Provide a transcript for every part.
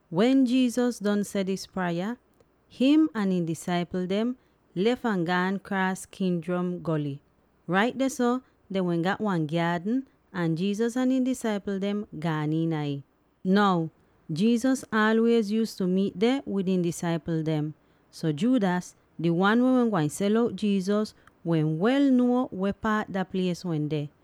Wen Jesus don seh dis praya, him ahn ihn disaipl dem lef ahn gaan kraas Kidron Goly. Rait dehso dehn wehn gat wan gyaadn, ahn Jesus ahn ihn disaipl dem gaan iina ih. Now Jesus aalwiez yuuztu miit deh wid ihn disaipl dem, so Judas —di wan weh wehn gwain sel out Jesus— wehn wel ahn nuo weh paat dah plies wende.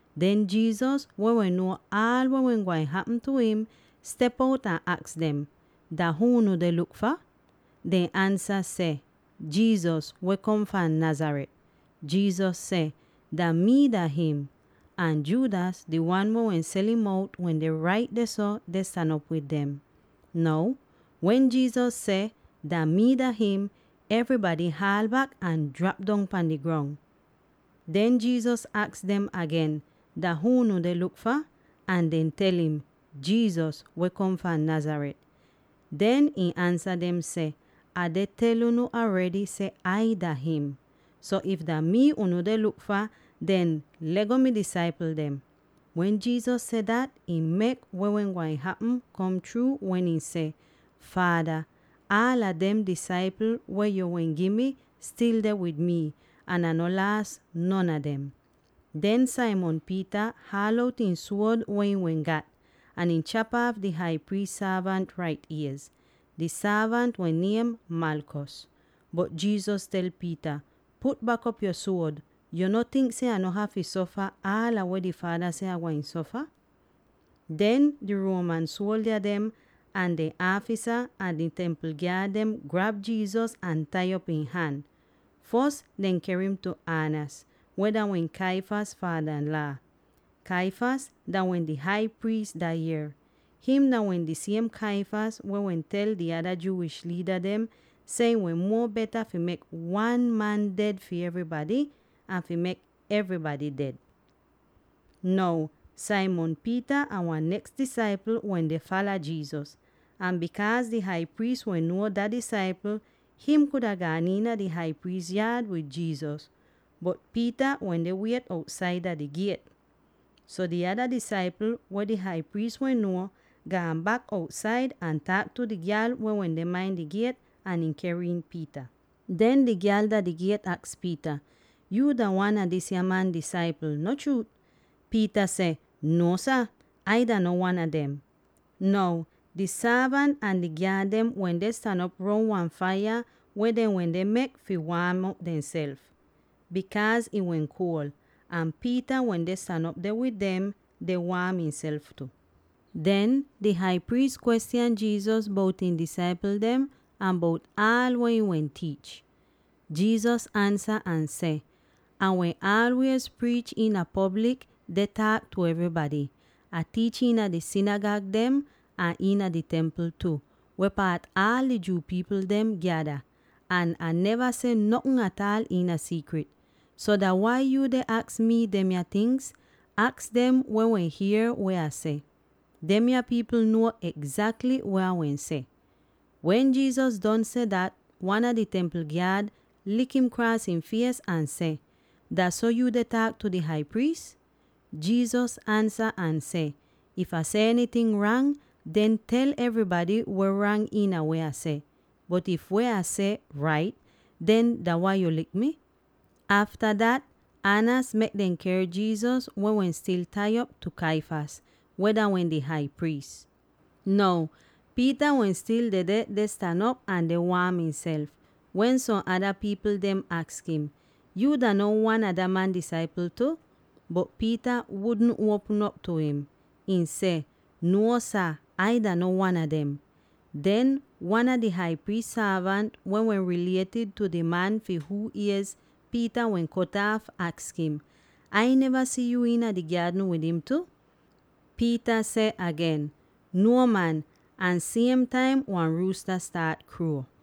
Den Jesus, weh wehn nuo aal weh wehn gwain hapm tu im, step out ahn aks dem, “Dah huu unu deh luk fah?” Dehn ansa seh, “Jesus, weh kom fahn Nazareth.” Jesus seh, “Dah mii dah him!” Ahn Judas —di wan weh wehn sel'im out— wende rait dehso, deh stan op wid dem. Now, wen Jesus seh, “Dah mii dah him,” evrybady haal bak ahn jrap pan di grong! Den, Jesus aks dem agen, “Dah huu unu deh luk fah?” Ahn dehn tel im, “Jesus, weh kom fahn Nazareth.” Den ihn ansa dem seh, “Ah tel unu aredy seh Ai dah him. So, if dah mii unu deh luk fah, den le'go mi disaipl dem.” Wen Jesus seh dat, ih mek weh wehn gwain hapm kom chruu wen ihn seh, “Faada, aala dem disaipl weh yu wehn gi mi stil deh wid mi, ahn Ah no laas non a dem.” Den Simon Peter haal out ihn suod weh ihn wehn gat, ahn ihn chap aaf di Hai Priis sorvant rait iez. Di sorvant wehn niem Malchus. Bot Jesus tel Peter, “Put bak op yo suod. Yo no tink seh Ah no hafy sofa aal weh di Faada seh Ah gwain sofa?” Den di Roman suoldya dem, ahn dehn aafisa, ahn di Templ gyaad dem grab Jesus ahn tai op ihn han. Fos dehn ker im tu Annas, weh dah wehn Caiaphas faadanlaa. Caiaphas dah wehn di Hai Priis dah yier. Him dah wehn di siem Caiaphas weh wehn tel di ada Jewish liida dem seh ih wehn muo beta fi mek wan man ded fi evrybady, an fi mek evrybady ded. Now, Simon Peter ahn wan neks disaipl wende fala Jesus. Ahn bikaaz di Hai Priis wehn nuo dah disaipl, him kuda gaan iina di Hai Priis yaad wid Jesus, bot Peter wende wiet outsaid dah di giet. So di ada disaipl —weh di Hai Priis wehn nuo— gaan bak outsaid ahn taak tu di gyal weh wende main di giet, ahn ihn ker iin Peter. Den di gyal dah di giet aks Peter, “Yuu dah wan a disya man disaipl, no chruut?” Peter seh, “Nuo sah, Ai dah no wan a dem.” Now di sorvant ahn di gyaad dem wende stan op roun wan faiya weh dehn wehn mek fi waam demself, bikaaz ih wehn kuol. Ahn Peter wende stan op deh wid dem deh waam ihnself tu. Den, di Hai Priis kwestyan Jesus bout ihn disaipl dem ahn bout aal weh ihn wehn tiich. Jesus ansa ahn seh, “Ah wehn aalwiez priich iina poblik deh taak tu evrybady. Ah tiich iina di sinigag dem ahn iina di Templ tu, weh paat aal di Jew pipl dem gyada, ahn Ah neva seh notn ataal iina siikrit. So dah wai yu deh aks mii demya tingz? Aks dem weh wehn hier weh Ah seh. Demya pipl nuo egzakly weh Ah wehn seh.” Wen Jesus don seh dat, wan a di Templ gyaad lik'im kraas ihn fies ahn seh, “Dah so yuu deh taak tu di Hai Priis?” Jesus ansa ahn seh, “If Ah seh enyting rang, den tel evrybady weh rang iina weh Ah seh. Bot if weh Ah seh rait, den dah wai yu lik mi?” Afta dat Annas mek dehn ker Jesus —weh wehn stil tai op— tu Caiphas, weh dah wehn di Hai Priis. Now Peter wehn stil dedeh deh stan op ahn deh waam ihnself, wen som ada pipl dehn aks im, “Yuu dah no wan a dah man disaipl tu?” Bot Peter wudn uon'op tu ih; ihn seh, “Nuo sah! Ai dah no wan a dem.” Den wan a di Hai Priis sorvant, weh wehn rilietid tu di man fi huu iez Peter wehn kot aaf, aks im, “Ai neva si yuu iina di gyaadn wid im tu?” Peter seh agen, “Nuo, man!” —ahn siem taim wan ruusta staat kruo.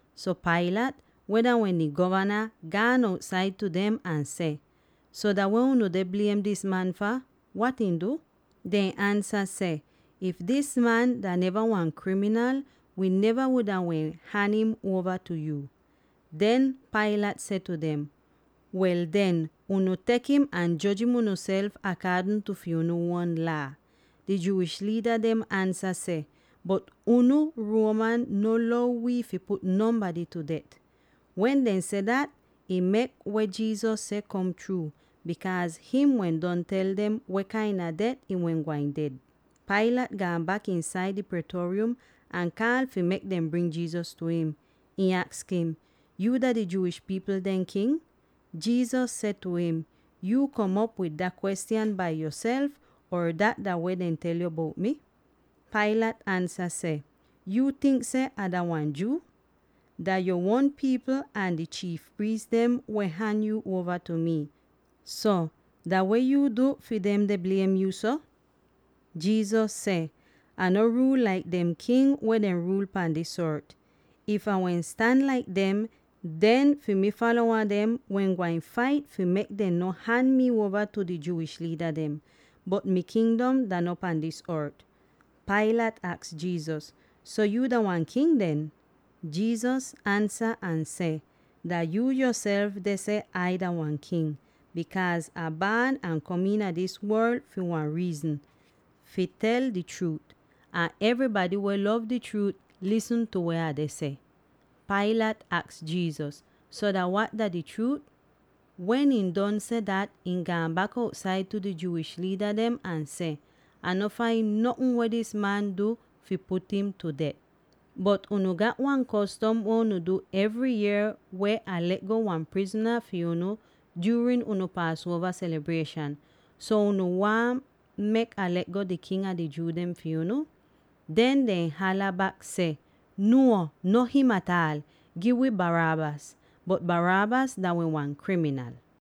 So Pilate, weh dah wehn di govana, gaan outsaid tu dem ahn seh, “So dah weh unu deh bliem dis man fah; wat ihn du?” Dehn ansa seh, “If dis man dah neva wan kriminal, wi neva wuda wehn han im uova tu yu.” Den Pilate seh tu dem, “Wel den, unu tek im ahn joj im unuself akaadn tu fi unu uon laa.” Di Jewish liida dem ansa seh, “Bot, unu Roman no lou wii fi put nonbady tu det.” (Wen dehn seh dat, ih mek weh Jesus wehn seh kom chruu, bikaaz him wehn don tel dem weh kain a det ihn wehn gwain ded.) Pilate gaan bak iinsaid di Praetorium ahn kaal fi mek dem bring Jesus tu im. Ihn aks im, “Yuu dah di Jewish pipl dehn King?” Jesus seh tu im, “Yu kom op wid dah kwestyan bai yoself, or dat dah weh dehn tel yo bout mi?” Pilate ansa seh, “Yuu tink seh Ah dah wan Jew? Dah yu uon pipl ahn di chiif priis dem weh han yo uova tu mi. So, dah weh yu du fi dem deh bliem yo so?” Jesus seh, “Ah no ruul laik dem king weh deh ruul pahn dis ort. If Ah wehn stan laik dem, den fi mi falowa dem wehn gwain fait fi mek dem no han mi uova tu di Jewish liida dem. Bot mi kingdom dah no pan dis ort.” Pilate aks Jesus, “So yuu dah wan king den?” Jesus ansa ahn seh, “Dah yu yoself deh seh Ai dah wan king; bikaaz Ah baan ahn kom iina dis worl fi wan riizn: fi tel di chruut. Ahn evrybady weh lov di chruut lisn tu weh Ah deh seh.” Pilate aks Jesus, “So dah wat dah di chruut?” Wen ihn don seh dat, ihn gaan bak outsaid tu di Jewish liida dem ahn seh, “Ah no fain notn weh dis man du fi put im tu det. Bot unu gat wan kostom weh unu du evry yier weh Ah le'go wan prizna fi unu juurin unu Paasuova selibrieshan. So unu waahn mek Ah le'go di King a di Jew dem fi unu?” Den dehn hala bak seh, “Nuo, no him ataal! Gi wi Barabbas!” (Bot Barabbas dah wehn wan kriminal.)